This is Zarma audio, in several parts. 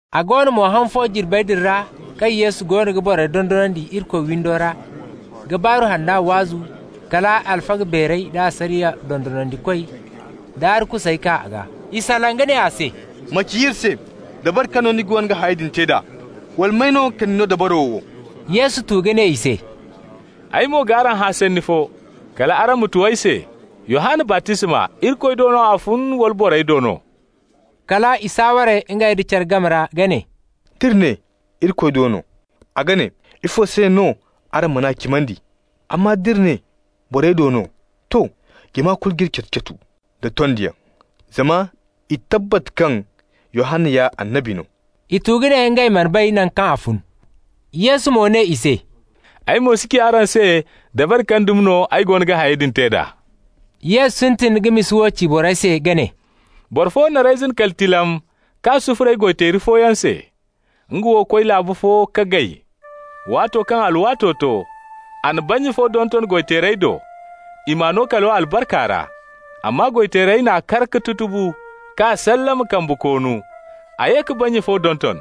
A go no mo, han fo jirbey din ra kaŋ Yesu goono ga borey dondonandi Irikoy windo ra, ka Baaru Hanna waazu, kala alfaga beerey da asariya dondonandikoy da arkusey kaa a gaa. I salaŋ ka ne a se: «Ma ci iri se dabari kaŋ no ni goono ga hayey din te d'a? Wala may no ka ni no dabaro wo?» Yesu tu ka ne i se: «Ay mo g'araŋ hã sanni fo, kal araŋ ma tu ay se. Yohanna baptisma, Irikoy do no a fun, wala borey do no?» Kala i saaware ngey da care game ra ka ne: «D'iri ne: ‹Irikoy do no›, a ga ne: ‹Ifo se no araŋ man'a cimandi?› Amma d'iri ne: ‹Borey do no› -- to, jama kulu g'iri catu-catu nda tondiyaŋ, zama i tabbat kaŋ Yohanna ya annabi no.» I tu ka ne ngey mana bay nangu kaŋ a fun. Yesu mo ne i se; «Ay mo si ci araŋ se dabari kaŋ dumi no ay goono ga hayey din te d'a.» Yesu sintin ka misa wo ci borey se ka ne: «Boro fo na reyzin kali tilam k'a sufuray goy-teeri fooyaŋ se. Nga wo koy laabu fo ka gay. Waato kaŋ alwaato to, a na bannya fo donton goy-teerey do, i m'a no kalo albarka ra. Amma goy-teerey n'a kar ka tutubu, k'a sallama kambe koonu. A ye ka bannya fo donton.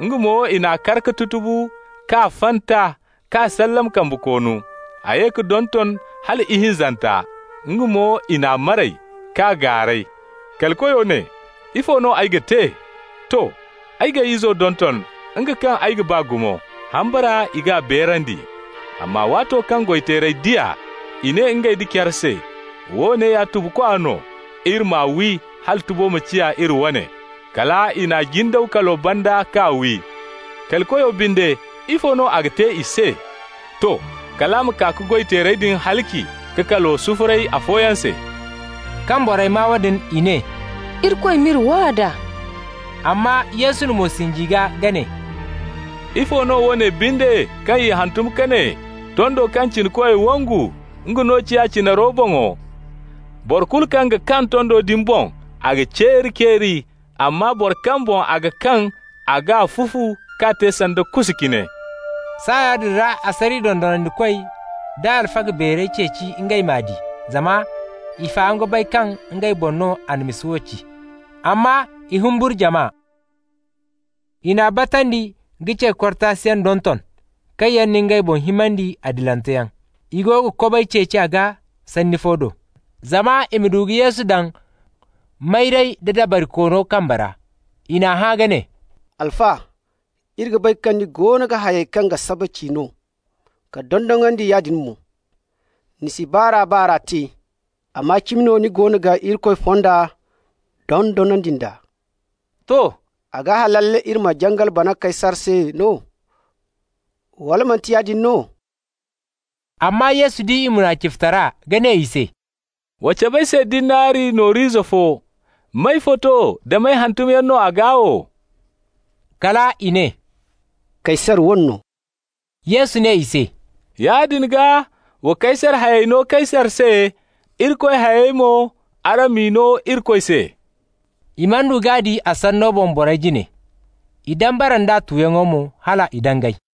Nga mo, i n'a kar ka tutubu, k'a fanta, k'a sallama kambe koonu. A ye ka donton hala ihinzanta. Nga mo i n'a maray, k'a gaaray. Kali koyo ne: ‹Ifo no ay ga te? To. Ay g'ay izo donton, nga kaŋ ay ga ba gumo. Hambara i g'a beerandi.› Amma waato kaŋ goy-teerey di a, i ne ngey da care se: ‹Woone ya tubukwa no. Iri m'a wi hala tubo ma ciya iri wane.› Kala i n'a jindaw kalo banda k'a wi. Kali koyo binde, ifo no a ga te i se? To. Kal a ma kaa ka goy-teerey din halaci ka kalo sufuray afooyaŋ se.» Kaŋ borey maa woodin i ne: «Irikoy m'iri waa d'a!» Amma Yesu na mo sinji i gaa ka ne: «Ifo no woone binde kaŋ i hantum ka ne: ‹Tondo kaŋ cinakoy wangu, nga no ciya cinaro boŋo›? Boro kulu kaŋ ga kaŋ tondo din boŋ, a ga ceeri-ceeri, amma bora kaŋ boŋ a ga kaŋ, a g'a fufu k'a te sanda kusa cine.» Saaya din ra asariya dondonandikoy da alfaga beerey ceeci ngey m'a di, zama i faham ka bay kaŋ ngey boŋ no a na misa wo ci, amma i humburu jama. I n'a batandi ka ce-kortasiyaŋ donton, kaŋ yaŋ na ngey boŋ himandi adilanteyaŋ. I go ga kobay ceeci a gaa sanni fo do, zama i ma du ka Yesu daŋ mayray da dabarikoono kambe ra. I n'a hã ka ne: «Alfa, iri ga bay kaŋ ni goono ga hayey kaŋ ga saba ci no, ka dondonandi yaadin mo. Ni si baar'a-baar'a te, amma cimi no ni goono ga Irikoy fonda dondonandi nd'a. To. A ga halal iri ma jangal bana Kaysar se no, wala manti yaadin no?» Amma Yesu di i munaficitara, ka ne i se: «Wa cab'ay se dinari nooru ize fo. May foto da may hantumyaŋ no a gaa wo?» Kal i ne: «Kaysar wane no.» Yesu ne i se: «Yaadin gaa, wa Kaysar hayey no Kaysar se. Irikoy hayey mo, araŋ m'i no Irikoy se.» I mana du k'a di a sanno boŋ borey jine. I dambara nd'a tuyaŋo mo, hal i dangay.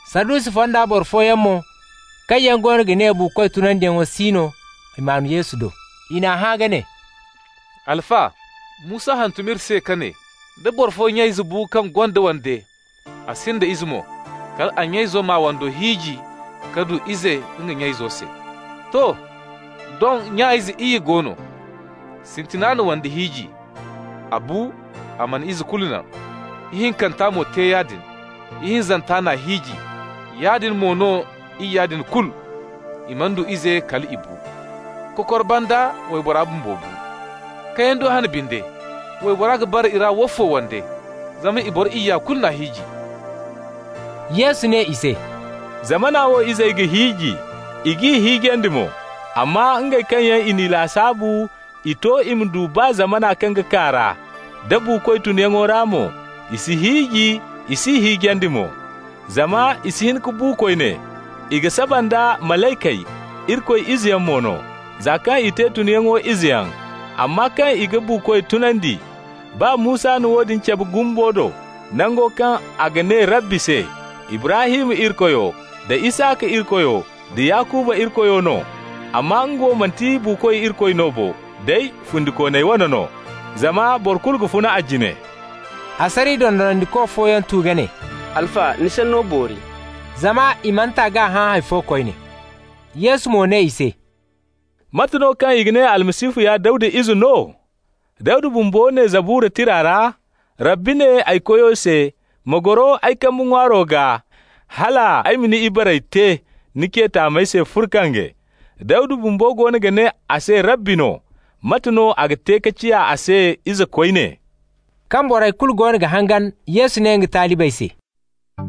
Sadusi fonda boro fooyaŋ mo, kaŋ yaŋ goono ga ne buukoy tunandiyaŋ si no, maan Yesu do. I n'a hã ka ne: «Alfa, Musa hantum iri se ka ne: da boro fo nya-ize bu kaŋ gonda wande, a sinda ize mo, kal a nya-izo m'a wando hiiji ka du ize nga nya-izo se. To. Doŋ, nya-ize iyye go no. Sintina na wande hiiji. A bu, a mana ize kulu naŋ. Ihinkanta mo te yaadin. Ihinzanta n'a hiiji. Yaadin mo no iyya din kulu, i mana du ize kal i bu. Kokor banda waybora bumbo bu. Kayando hane binde, waybora ga bara i ra woofo wande, zama i boro iyya kulu n'a hiiji?» Yesu ne i se: «Zamana wo izey ga hiiji, i g'i hiijandi mo. Amma ngey kaŋ yaŋ i n'i lasaabu i to i ma du baa zamana kaŋ ga kaa ra, da buukoy tunyaŋo ra mo, i si hiiji, i s'i hiijandi mo, zama i si hin ka bu koyne. I ga saba nda malaykey, Irikoy izeyaŋ mo no, za kaŋ i te tunyaŋo izeyaŋ. Amma kaŋ i ga buukoy tunandi, baa Musa na woodin cabe gumbo do, nango kaŋ a ga ne Rabbi se ‹Ibrahim Irikoyo, da Isaka Irikoyo, da Yakuba Irikoyo no.› Amma nga wo manti buukoy Irikoyo no bo, day fundikooney wane no. Zama boro kulu ga funa a jine.» Asariya dondonandiko fooyaŋ tu ka ne: «Alfa, ni sanno boori.» Zama i mana ta k'a hã hay fo koyne. Yesu mo ne i se: «Mate no kaŋ i ga ne Almasihu ya Dawda ize no? Dawda bumbo ne Zabura tira ra: Rabbi ne ay Koyo se: ‹Ma goro ay kambe ŋwaaro gaa, hal ay ma ni ibarey te ni ce taamey se furkange.› Dawda bumbo goono ga ne a se Rabbi no. Mate no a ga te ka ciya a se ize koyne?» Kaŋ borey kulu goono ga hangan, Yesu ne nga talibey se: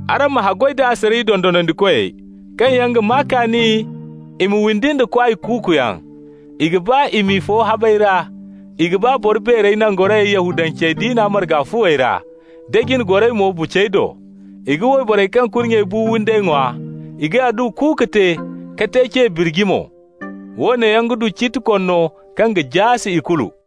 «Araŋ ma haggoy da asariya dondonandikoy, kaŋ yaŋ ga maa kaani i ma windi nda kwaay kuuku yaŋ. I ga ba i m'i fo habey ra. I ga ba boro beerey nangorayey Yahudance diina marga fuwey ra, da jine goray mo bucey do. I ga wayborey kaŋ kurnyey bu windey ŋwa, i ga adduwa kuuku te ka te ce birji mo. Woone yaŋ ga du ciiti konno kaŋ ga jaase ikulu.»